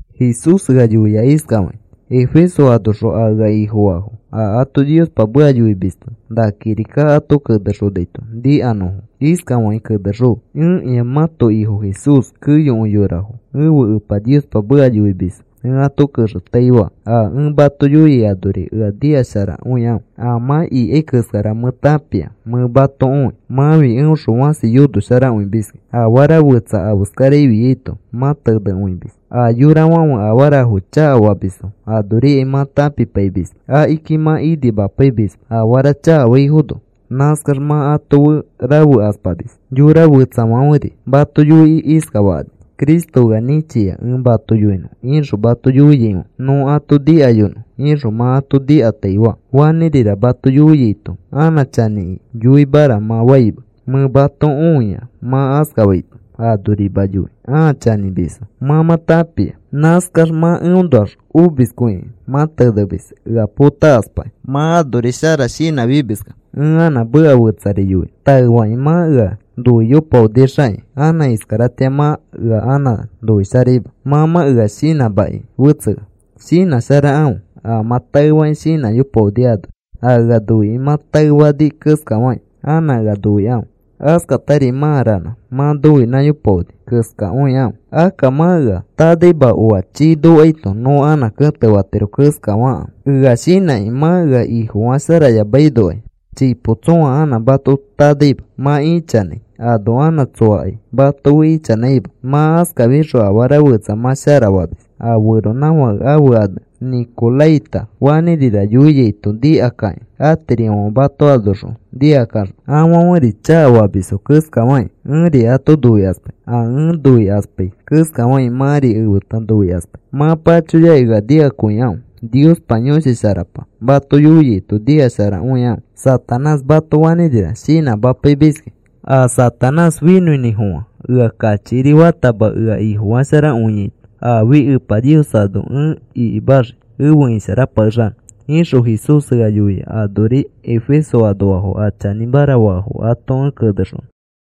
Jesús ea yoia iskafakĩ: “Efeso anoxõ a ea Ifofaafo a ato Niospa meka yoimisto na kirika ato anexonaito nikanõfo, iskafakĩ kenexõfe: ‘Ẽkĩa mãto Ifo Jesús keyokõi yorafo ẽfe Epa Niospa meka yoimisfo ẽ ato kexetaifaa. A ẽ mato yoiai anori ea nikasharakõikãfe. A mã ikai keskara mẽ tãpia, mẽ mato õi. Mãfi eõxõ fãsi yonosharakõimiskĩ. Afara fetsa afeskara afiaito mã tenekõimis. A yorafãfe afarafo chakafamisfo anorikai mã tãpipaimisma. Akiki mã inimapaimisma afara chakafaifono, nãskax mã ato fe rafekaspamis. Yora fetsafãferi mato yoikĩ iskafakani: “Cristo ea nĩchia ẽ mato yoinõ,” ixõ mato yoiaifãfe, “Nõ ato nikayonõ,” ixõ mã ato nikataifaa. Fanĩrira mato yoiaito anã chanĩki yoimara mã faima mẽ mato õia mã askafaito. Anorima yoi ãa chanĩmisfo mã mã tãpia. Nãskax mã eõnoax omiskõikĩ mã tenemis ea potakaspakĩ. Mã anori shara shinãfimiskẽ ẽ anã meka fetsari yoinõ. Taefakĩ mã ea noiyopaonixakĩ anã iskaratĩa mã ea anã noisharaima. Mã mã ea shinãmaki fetsea. Shinãsharakãfe a mã taefakĩ shinãyopaoni anori. A ea noikĩ mã taefani keskafakĩ anã ea noikãfe. Askatari mã ranã mã nõinãyopaoni keskakõikãfe. Akka mã ea tanaima, oa chii nokaito nõ anã kẽtefatiro keskafakãfe ea shinãkĩ. Mã ea Ifofasharayamainokai chipo tsõa anã mato tanaima. Mã ichanãi ano anã tsoakai mato fe ichanãima. Mã askafixõ afara fetsa mã shara famis. A feronãfake ãfe ane Nĩkoraita fanĩrira yoiaito nikakakĩ atirifãfe mato anoxõ nikakaxõ, afãferi chakafamisfo keskafakĩ ẽri ato noikaspai. A ẽ noikaspai keskafakĩ mãri efeta noikaspai. Mã pachoyakĩ ea nikakõikãfe. Niospa Yõshi Sharapa mato yoiaito nikasharakõikãfe. Satanás mato fanĩrira shinãmapaimiskĩ. A Satanás finõinĩfofã ea kachikiri fatama ea Ifofasharakõiaito, aafi Epa Nios ano ẽ ikimaxii efe isharapakexanõ,’” ixõ Jesús ea yoia anori Efeso anoafo a chanĩmara faafo ato ẽ kenexonõ.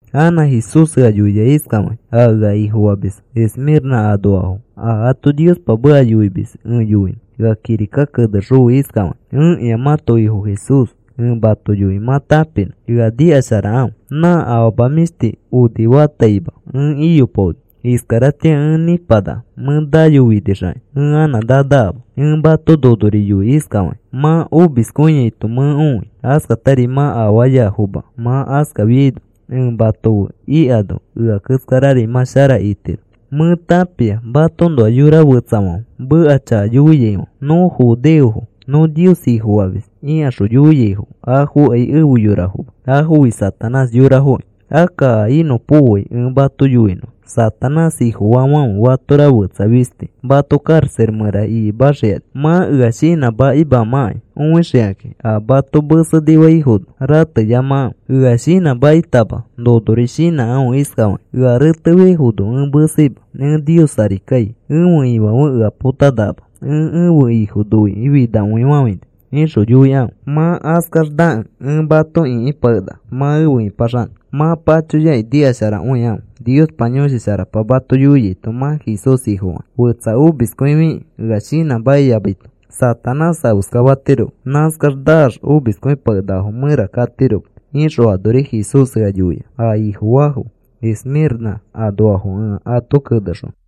Anã Jesús ea yoia iskafakĩ: “A ea Ifofamisfo Esmĩrnã anoafo a ato Niospa meka yoimis ẽ yoinõ ea kirika kenexõfe iskafakĩ: ‘Ẽkĩa mãto Ifo Jesús ẽ mato yoi mã tãpinõ. Ea nikasharakãfe. Nã afama mĩshti onifataima ẽ iyopaoni. Iskaratĩa ẽ nĩpanaka. Mẽ nayofinixakĩ ẽ anã nanakama. Ẽ mato nonori yoi iskafakĩ: Mã omiskõiaito mẽ õi. Askatari mã afaayafoma. Mã askafiaino ẽ mato fe ikano, ea keskarari mã shara itiro. Mẽ tãpia matoõnoa yora fetsafãfe meka chakayoiaifãfe. “Nõ judeofo, nõ Nios Ifofamis,” ikaxõ yoiaifo afokai efe yorafoma. Afofi Satanás yorafoki. Akka a inõpokoai ẽ mato yoinõ. Satanás ifofaafãfe fatora fetsa fisti mato karaxa mẽra ikimaxikani mã ea shinãmakimãkai õixikakĩ. A mato mesenifaifono rateyamakãfe. Ea shinãmakitama nonori shinãkãfe iskafakĩ: “Ea retefiaifono ẽ meseima, ẽ Nios ari kai. Ẽfe Ifãfe ea potanakama. Ẽ ẽfe Ifo noikĩ finakõifafãini,” ixõ yoikãfe. Mã askax, nakẽ, ẽ mato ĩkipakenaka mã efe ĩpaxanõ. Mã pachoyakĩ nikasharakõikãfe Niospa Yõshi Sharapa mato yoiaito mã Jesús Ifofakĩ. Fetsa omiskõifikĩ ea shinãmakiyamaito Satanás afeskafatiroma. Nãskax naax a omiskõipakenakafo mẽra katiroma,’” ixõ anori Jesús ea yoia a Ifofaafo Esmĩrnã anoafo ẽ ato kenexonõ.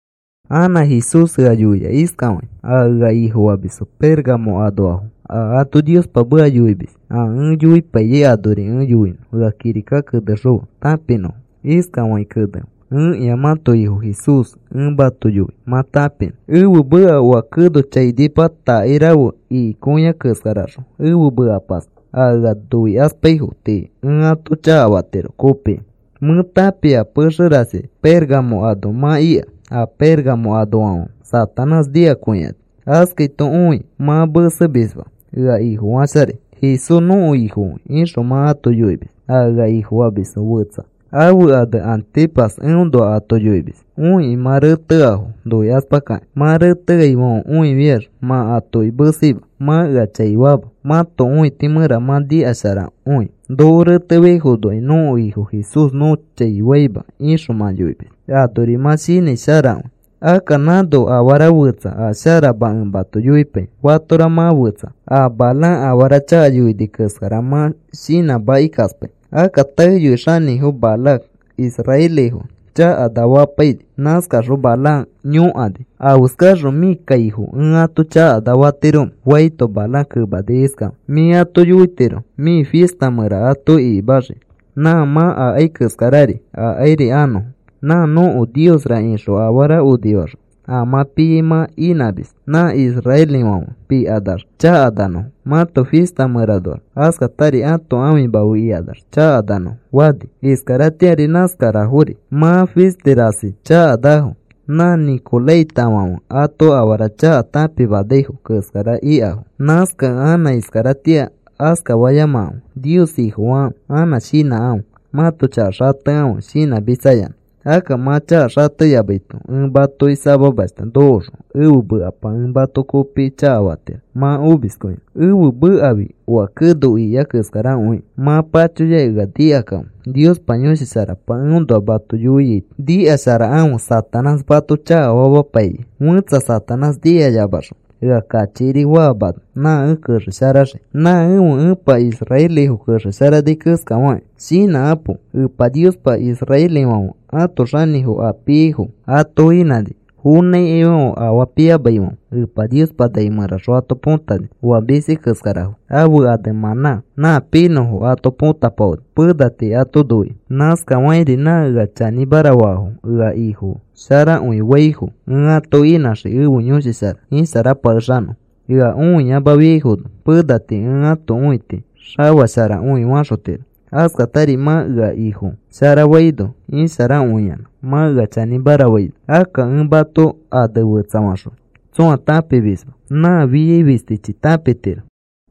Anã Jesús ea yoia iskafakĩ: “A ea Ifofamisfo Pérgamo anoafo a ato Niospa meka yoimis a ẽ yoipaiyai anori ẽ yoinõ ea kirika kenexõfe tãpinõfo. Iskafakĩ kenefe: ‘Ẽkĩa mãto Ifo Jesús ẽ mato yoi mã tãpinõ. Ẽfe meka oa keno chainipa takairafe ikikõiai keskaraxõ, ẽfe mekapas a ea noikaspaifo tii ẽ ato chakafatiro kopikĩ. Mẽ tãpia a pexe rasi Pérgamo ano mã ika. A Pérgamo anoafãfe Satanás nikakõikani. Askaito õi mã mesemisma, ea Ifosharafai. “Jesús nõko Ifokõi,” ixõ mã ato yoimis. A ea Ifofamis fetsa ãfe ane Antipas eõnoa ato yoimis õikĩ mã reteafo noikaspakakĩ. Mã reteaifãfe õifiax mã atoki meseima, mã ea chai faama. Mãto õiti mẽra mã shinãsharakõi. “Noko retefiaifonokai nõko Ifo Jesús nõ chai faima,” ixõ mã yoimis. Anori mã shinãi sharakõi. Akka nãno afara fetsa a sharama ẽ mato yoipai. Fatora mã fetsa a Balaam afara chaka yoini keskara mã shinãmakikaspai. Akka taeyoi xanĩfo Balac israelifo chakana famapaini. Nãskaxõ Balaam yõkani: “¿Afeskaxõ mĩ kaifo ẽ ato chakana famatiromẽ?” faito, Balaam kemani iskafakĩ: “Mĩ ato yoitiro mĩ fista mẽra ato ikikixiki. Nã mã akai keskarari akairi anõfo. Nã nõko niosra ixõ afara onifaxõ a mã piai mã inãmis. Nã israelifãfe pikanax chakananõfo mãto fista mẽranoax. Askatari ãto ãfima fe ikanax chakananõfo,” fani. Iskaratĩari nãskarafori mã fisti rasi chakanafo nã Nicolaitafãfe ato afara chaka tãpimanaifo keskara ikafo. Nãskakẽ anã iskaratĩa askafayamakãfe. Nios Ifofakãfe, anã shinãkãfe. Mãto chaka xatekãfe shinãmitsayanã. Akka mã chaka xateyamaito, ẽ matoki samamashta nokoxõ ẽfe mekapa ẽ mato kopikĩ chakafatiro mã omiskõinõ. Ẽfe mekafi oa keno ikiai keskarakõikĩ. Mã pachoyaki ea nikakãfe. Niospa Yõshi Sharapa eõnoa mato yoiaito, nikasharakãfe. Satanás mato chakafamapai. Fẽtsa Satanás nikayamaxõ ea kachikiri faamano, nã ẽ kexesharaxii nã ẽfe Epa israelifo kexesharani keskafakĩ. Shinãkapo. Epa Niospa israelifãfe ãto xinifo a piaifo ato inãni fonãikaifãfe afaa piamaifãfe Epa Niospa nai mẽraxõ ato põtani oa misi keskarafo ãfe ane mãnã nã pinõfo ato põtapaoni pena tii ato noikĩ. Nãskafakĩri nã ea chanĩmara faafo ea Ifo sharakõi faifo ẽ ato inãxii ẽfe Yõshi Shara isharapakexanõfo. Ea õiyamafiaifono pena tii ẽ ãto õiti xafasharakõi faxotiro. Askatari mã ea Ifo sharafaifono isharakõiyanã mã ea chanĩmara faino, akka ẽ mato ane fetsafaxõi tsõa tãpimisma, nã fiai fistichi tãpitiro.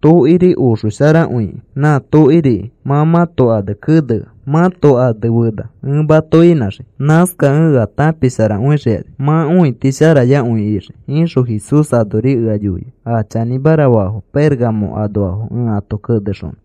Tokiri oxosharakõikĩ nã tokiriki mã mãto ane kenea mãto ane fena ẽ mato inãxii. Nãskakẽ ea tãpisharakõixikani. Mã õitisharayakõi ixii,’” ixõ Jesús anori ea yoia a chanĩmara faafo Pérgamo anoafo ẽ ato kenexonõ.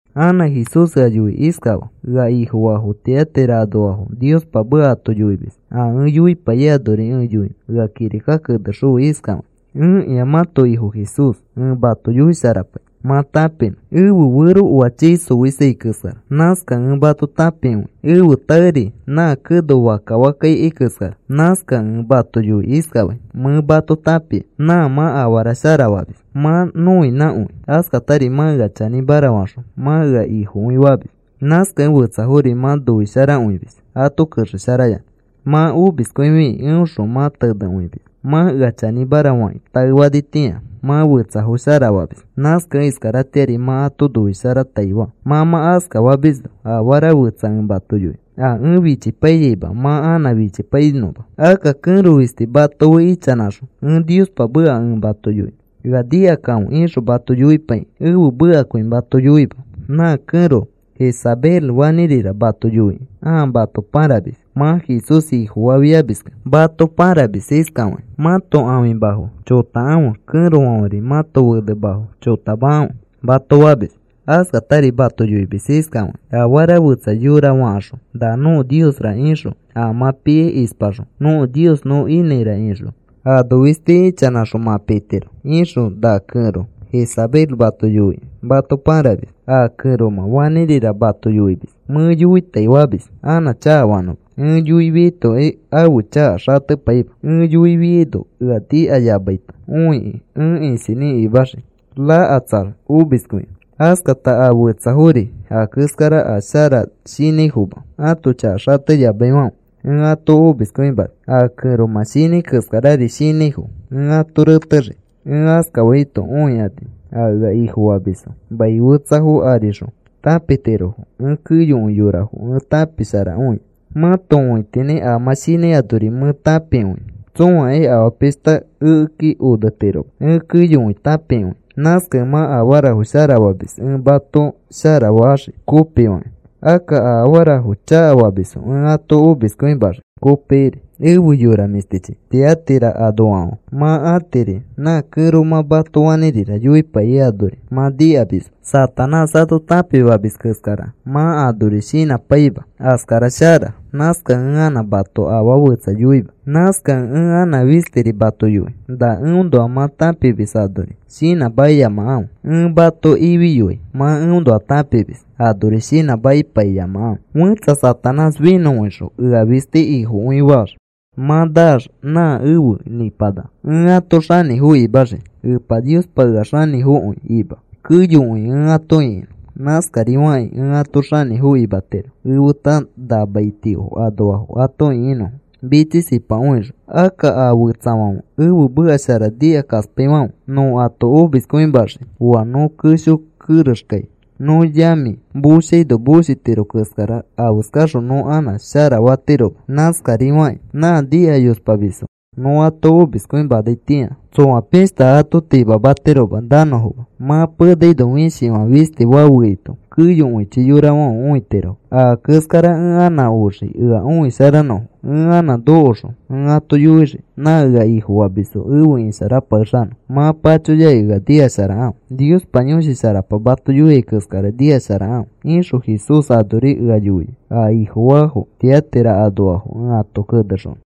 Anã Jesús ea yoikĩ iskafaa: “Ea Ifofaafo Tiatira anoafo Niospa meka ato yoimis a ẽ yoipaiyai anori ẽ yoinõ ea kirika kenexõfe iskafakĩ: ‘Ẽkĩa ẽ mãto Ifo Jesús ẽ mato yoisharapai mã tãpinõ. Ẽfe fero oa chii xoisai keskara. Nãskakẽ ẽ mato tãpikõia. Ẽfe taeri nã keno fakka fakka ikai keskara. Nãskakẽ ẽ mato yoikĩ iskafai: “Mẽ mato tãpia, nã mã afara shara famis. Mã nõinãkõi. Askatari mã ea chanĩmara faxõ mã ea Ifokõi famis. Nãskakẽ fetsafori mã noisharakõimis ato kexesharayanã. Mã omiskõifikĩ eõxõ mã tenekõimis. Mã ea chanĩmara fakĩ taefanitĩa mã fetsafo sharafamis. Nãskakẽ iskaratĩari mã ato noisharataifaa. Mã mã askafimisno afara fetsa ẽ mato yoinõ a ẽ fichipaiyaima mã anã fichipainõma. Akka kẽro fisti mato fe ichanãxõ, ‘Ẽ Niospa meka ẽ mato yoinõ, ea nikakãfe,’ ixõ mato yoipaikĩ, ẽfe mekakõi mato yoima. Nã kẽro Jezabel fanĩrira mato yoikĩ ãa mato pãramis. Mã Jesús Ifofafiamiskẽ mato pãramis iskafakĩ: ‘Mãto ãfimafo chotakãfe; kẽrofãferi mãto fenemafo chotamakãfe,’ mato famis. Askatari mato yoimis iskafakĩ: ‘Afara fetsa yora fakaxõ, nã nõko niosra ixõ, a mã piai ispaxõ nõko nios nõ inãira ixõ, ano fisti ichanãxõ, mã pitiro,’ ixõ na kẽro Jezabel mato yoikĩ mato pãramis. A kẽromã fanĩrira mato yoimis mẽ yoitaifamis anã chakafanõma. Ẽ yoifiaitokai ãfe chaka xatepaima. Ẽ yoifiaino ea nikayamaito õikĩ ẽ isinĩ imaxii rakatsax omiskõinõ. Askata a fetsafori a keskara a sharashinãifoma ãto chaka xateyamaifãfe ẽ ato omiskõimani. A kẽromã shinãi keskarari shinãifo ẽ ato retexii. Ẽ askafaito, õikani a ea Ifofamisfo mai fetsafo arixõ tãpitirofo ẽ keyokõi yorafo ẽ tãpisharakõia. Mãto õitinĩ a mã shinãi anori mẽ tãpikõia. Tsõakai afaa pishta ekeki onetiroma. Ẽ keyokõi tãpikõia. Nãskakẽ mã afarafo shara famis ẽ mato shara faxii kopifakĩ. Akka a afarafo chakafamisfo ẽ ato omiskõimaxii kopikiri. Efe yora mĩshtichi Tiatira anoafãfe, mã atiri nã kẽromã mato fanĩrira yoipaiyai anori mã nikamisma. Satanás ato tãpimamis keskara mã anori shinãpaima. Askara shara. Nãskakẽ ẽ anã mato afaa fetsa yoima. Nãskakẽ ẽ anã fistiri mato yoi. Na eõnoa mã tãpimis anori shinãmakiyamakãfe. Ẽ mato ifiyoai mã eõnoa tãpimis anori shinãmakipaiyamakãfe. Fẽtsa Satanás finõkõixõ, ea fisti Ifokõifaax mã naax nã efe nĩpanaka. Ẽ ato xanĩfo imaxii. Epa Niospa ea xanĩfokõi ima keyokõi ẽ ato ĩkinõ. Nãskarifakĩ ẽ ato xanĩfo imatiro efeta na maitio anoafo ato ĩkinõfo, mitsisipakõixõ. Akka a fetsafãfe ẽfe meka shara nikakaspaifãfe nõ ato omiskõimaxii. Oa nõ kesho kerexkai nõ yamĩ moshaino moshitiro keskara afeskaxõ nõ anã shara fatiroma. Nãskarifakĩ nã nikayospamisfo nõ ato omiskõimanaitĩa tsoa pishta ato timamatiroma nanõfoma. Mã penaino, fishifã fisti fafeaito, keyokõichi yorafãfe õitirofo. Aa keskara ẽ anã oxii ea õisharanõfo. Ẽ anã nokoxõ, ẽ ato yoixii nã ea Ifofamisfo efe isharapakexanõfo. Mã pachoyakĩ ea nikasharakãfe. Niospa Yõshi Sharapa mato yoiai keskara nikasharakãfe,”’” ixõ Jesús anori ea yoia a Ifofaafo Tiatira anoafo ẽ ato kenexonõ.